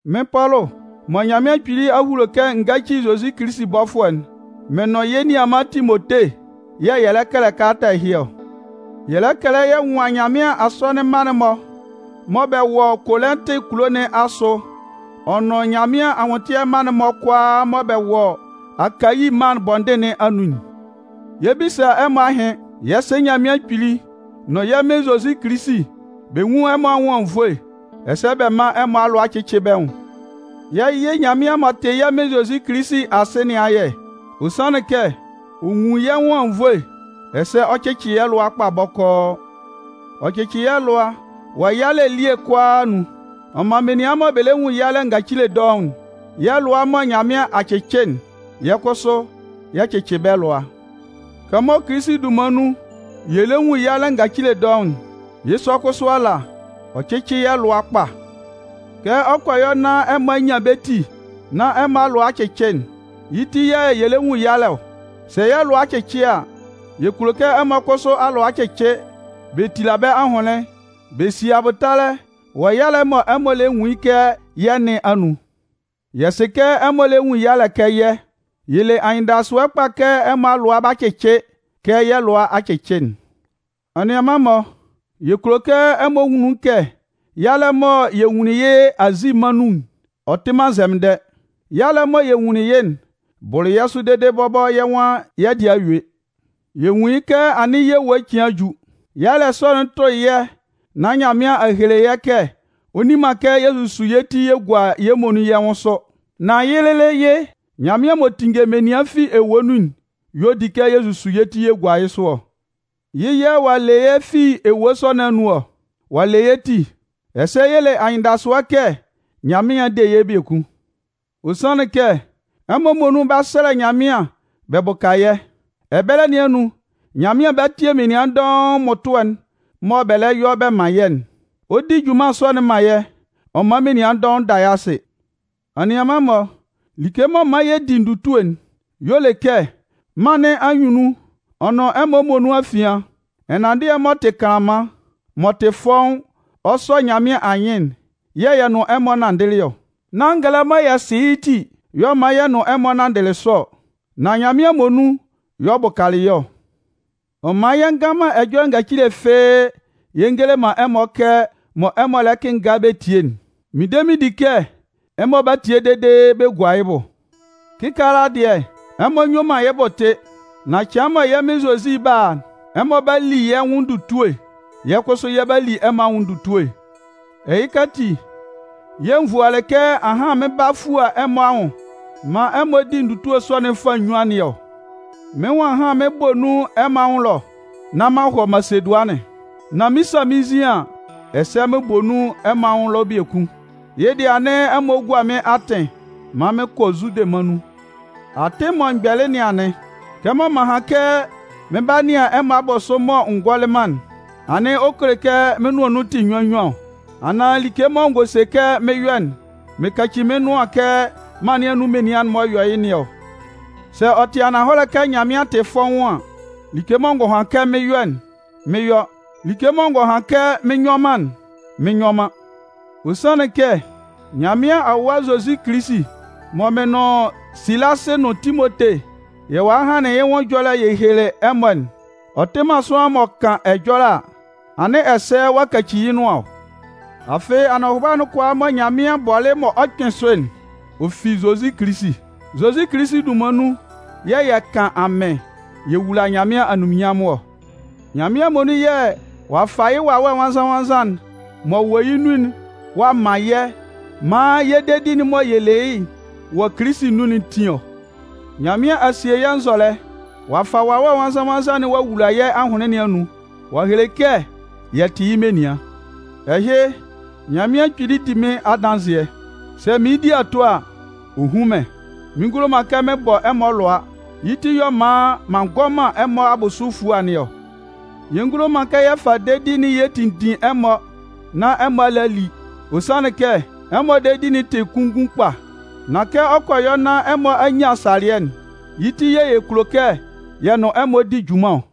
Mɩ́n Pɔlʋ, mɔ Nyanmɩan Kpili a hulo kɛ n gáci Zozi Kilisi bɔfʋɛ'n, mɩn nʋn yɛ́ nianman Timote yɛ̂ yɛ lɛ kɛlɛ kalata ɛhɩ ɔ. Yɛ lɛ kɛlɛ yɛ nwan Nyanmɩan asɔnɩn mma'n-mɔ mɔ bɛ wɔ Kolɩntɩ kulo nɩn asʋ ɔ nʋn Nyanmɩan anwʋntɩɛ mma'n-mɔ kʋalaa mɔ bɛ wɔ Akayi mân bɔndɩn nɩn anun'n. Yɛ 'bisa ɛmɔ ahɩn. Yɛ́ Sɩ Nyanmɩan Kpili nʋn yɛ́ Mɩn Zozi Kilisi, bɛ nwún ɛmɔ anwʋn anwunnvoe, ɛsɛ bɛ mán ɛmɔ alʋa cɩ́cɩ bɛ́ nwʋn. Yɛ 'yɩ Nyanmɩan m'ɔ tɩ yɛ́ Mɩn Zozi Kilisi Asɩ nɩn ayɛ. Ɔ sanlɩn kɛ ɔ nwun yɛ́ nwʋn anwunnvoe, ɛsɛ ɔ cɩcɩ yɛ́ lʋa kpa bɔkɔɔ. Ɔ cɩcɩ yɛ́ lʋa wɔ yɛ́ yalɛ elie kʋalaa anun. Ɔ man menian mɔ bɛ lɛ nwun yalɛ ngacile dɔʋn'n, yɛ́ lʋa mɔ Nyanmɩan a cɩcɩ'n, yɛ́ kʋsʋ yɛ cɩcɩ bɛ́ lʋa. Kɛmɔ Kilisi dunman nun yɛ lɛ nwun yalɛ ngacile dɔʋn'n, yɩ́ sɔ kʋsʋ ala, ɔ cɩcɩ yɛ́ lʋa kpa. Kɛ ɔ kɔ yɔ nán ɛmɔ a nyan bɛ́ ti nán ɛmɔ a lʋa a cɩcɩ'n, yɩ́ ti yɛ̂ yɛ lɛ nwun yalɛ ɔ. Sɛ yɛ́ lʋa a cɩcɩ a, yɛ kulo kɛ ɛmɔ kʋsʋ alʋa cɩcɩ bɛ tila bɛ́ ahʋnlɩn bɛ si abʋtalɛ wɔ yalɛ'n mɔ ɛmɔ lɛ nwun yɩ́ kɛ yɛ́ nɩn anun. Yɛ sɩ kɛ kɛmɔ ɛmɔ lɛ nwun yalɛ kɛ yɛ́'n, yɛ le anyɩndasʋɛ kpa kɛ ɛmɔ alʋa 'ba cɩcɩ kɛ yɛ́ lʋa a cɩcɩ'n. Anianman-mɔ, yɛ kulo kɛ ɛmɔ nwun nun kɛ yalɛ mɔ yɛ nwunlin yɩ́ Azi mân nun'n, ɔ tɩ man nzɛmɩndɛ. Yalɛ'n mɔ yɛ nwunlin yɩ́'n bʋlɩ yɛ́ sʋ dede bɔbɔ yɛ́ nwan yɛ́ dɩɛ a yue. Yɛ nwun yɩ́ kɛ anɩn yɛ́ ewue cɩan a ju. Yalɛ sɔ'n tʋlɩ yɛ́ nán Nyanmɩan a hele yɛ́ kɛ ɔ nni man kɛ yɛ susu yɛ́ ti yɛ gua yɛ́ muonun yɛ́ nwʋn sʋ. Nan yɩ́ lɩlɩ yɩ́, Nyanmɩan m'ɔ tinnge menian fi ewue nun'n y'ɔ di kɛ yɛ susu yɛ́ ti yɛ gua yɩ́ sʋ ɔ. Yɩ́ yɛ̂ ɔ'a yɩ yɛ́ fi ewue sɔ nɩn anun ɔ. Ɔ'a le yɛ́ ti. Ɛsɛ yɛ le anyɩndasʋɛ kɛ Nyanmɩan 'de yɛ́ biekun. Ɔ sanlɩn kɛ ɛmɔ muonun 'ba sɛlɛ Nyanmɩan bɛ bʋka yɛ́. Ɛbɛlɛ nɩn anun, Nyanmɩan 'ba tie menian dɔʋn mmʋtʋɛ'n mɔ bɛ lɛ yɔ bɛ man yɛ́'n. Ɔ 'di junman sɔ'n man yɛ́ ɔ man menian dɔʋn da yɩ́ asɩ. Anianman-mɔ, like m'ɔ man yɛ di ndutue'n y'ɔ le kɛ mân nɩn anyunnun ɔ nʋn ɛmɔ muonun afian, ɛnanndɩɛ m'ɔ tɩ kanlanman, m'ɔ tɩ fɔ́ʋ́n ɔ sɔ Nyanmɩan anyɩn'n yɛ̂ yɛ nʋn ɛmɔ nanndɩlɩ ɔ. Nán ngɛlɛ mɔ yɛ sɩ yɩ́ ti y'ɔ man yɛ nʋn ɛmɔ nanndɩlɩ sɔ ɔ, nan Nyanmɩan muonun y'ɔ bʋkalɩ yɛ́ ɔ. Ɔ man yɛ ngan man ɛjɔlɛ ngacile fɩ́ɩ́ yɛ ngele man ɛmɔ kɛ mɔ ɛmɔ lɛ kɩnnga bɛ tie'n. Mɩn de mɩn di kɛ ɛmɔ 'ba tie dede bɛ gua yɩ́ bʋ. Kɩkaala dɩɛ, ɛmɔ nyue man yɩ́ bʋ tɩ. Nan cɩan mɔ yɛ́ Mɩn Zozi 'ba a'n, ɛmɔ 'ba li yɛ́ nwʋn ndutue, yɛ́ kʋsʋ yɛ 'ba li ɛmɔ nwʋn ndutue. Ɛhɩka ati yɛ̂ n vualɩ kɛ ahan mɩn 'ba fua ɛmɔ anwʋn maan ɛmɔ di ndutue sɔ'n fâ nnyuan nɩn ɔ. Mɩ́n nwan ahan mɩn bɔ nun ɛmɔ anwʋn ɛlɔ nán m'an hɔ Masedʋanɩn, nán mɩn 'sa mɩ́n nzin an, ɛsɛ mɩn bɔ nun ɛmɔ anwʋn ɛlɔ biekun. Yɩ́ dɩɛ anɩn ɛmɔ gua mɩ́n atɩn maan mɩn kɔ Zude mân nun. Atɩn mɔ m gbɛlɩ nɩn anɩn. Kɛmɔ m'an han kɛ mɩn 'ba nɩan ɛmɔ abʋsʋ mɔ n gɔlɩ man'n, anɩn ɔ kele kɛ mɩ́n nʋan nun tɩ nnyuan nnyuan ɔ? Anaan like mɔ n gɔ se kɛ mɩn 'yɔ'n, mɩn kaci mɩ́n nʋan kɛ mân nɩn anun menian'n-mɔ yɔ yɩ́ nɩn ɔ? Sɛ ɔ tɩ ananhɔlɛ kɛ Nyanmɩan tɩ fɔ́ʋ́n an, like mɔ n gɔ han kɛ mɩn 'yɔ'n, mɩn yɔ. Like mɔ n gɔ han kɛ mɩn nyɔ man'n mɩn nyɔ man. Ɔ sanlɩn kɛ Nyanmɩan Awa Zozi Kilisi mɔ mɩn nʋn Silasɩ nʋn Timote yɛ walɩ hanlɩn yɩ́ nwʋn ɛjɔlɛ'n yɛ helelɩ ɛmɔ'n, ɔ tɩ man sʋanlan m'ɔ kan ɛjɔlɛ a, anɩn ɛsɛ ɔ'a kaci yɩ́ nʋan ɔ. Afɩ anɔhʋba'n kʋalaa mɔ Nyanmɩan bɔlɩ mɔ ɔ 'kpɩn sʋ'n, ɔ fi Zozi Kilisi. Zozi Kilisi dunman nun yɛ̂ yɛ kan amɩn yɛ wula Nyanmɩan anunminnyanmʋn ɔ. Nyanmɩan muonun yɛ̂ ɔ'a fa yɩ́ Wawɛ Nwannzan-nwannzan'n m'ɔ wɔ yɛ́ nun'n ɔ'a man yɛ́ maan yɛ́ dedi'n mɔ yɛ le yɩ́ wɔ Kilisi anun'n tin ɔ. Nyanmɩan a sie yɛ́ nzɔlɛ, ɔ'a fa Wawɛ Nwannzan-nwannzan'n ɔ'a wula yɛ́ ahʋnlɩn nɩn anun ɔ'a hele kɛ yɛ tɩ yɩ́ menian. Ɛhɩ, Nyanmɩan Kpili di mɩ́n adanzɩɛ. Sɛ mɩɩn di ato a, ɔ hún mɩ́n. Mɩn ngulo man kɛ mɩn bɔ ɛmɔ alʋa, yɩ́ ti y'ɔ man m'an ngɔ man ɛmɔ abʋsʋ efua nɩn ɔ. Yɛ ngulo man kɛ yɛ fa dedi'n yɛ tinndin ɛmɔ nán ɛmɔ a le a li. Ɔ sanlɩn kɛ ɛmɔ dedi'n ti kunngun kpa. Nan kɛ ɔ kɔ yɔ nán ɛmɔ a nyan salɩɛ'n, yɩ́ ti yɛ̂ yɛ kulo kɛ yɛ nʋn ɛmɔ di junman ɔ.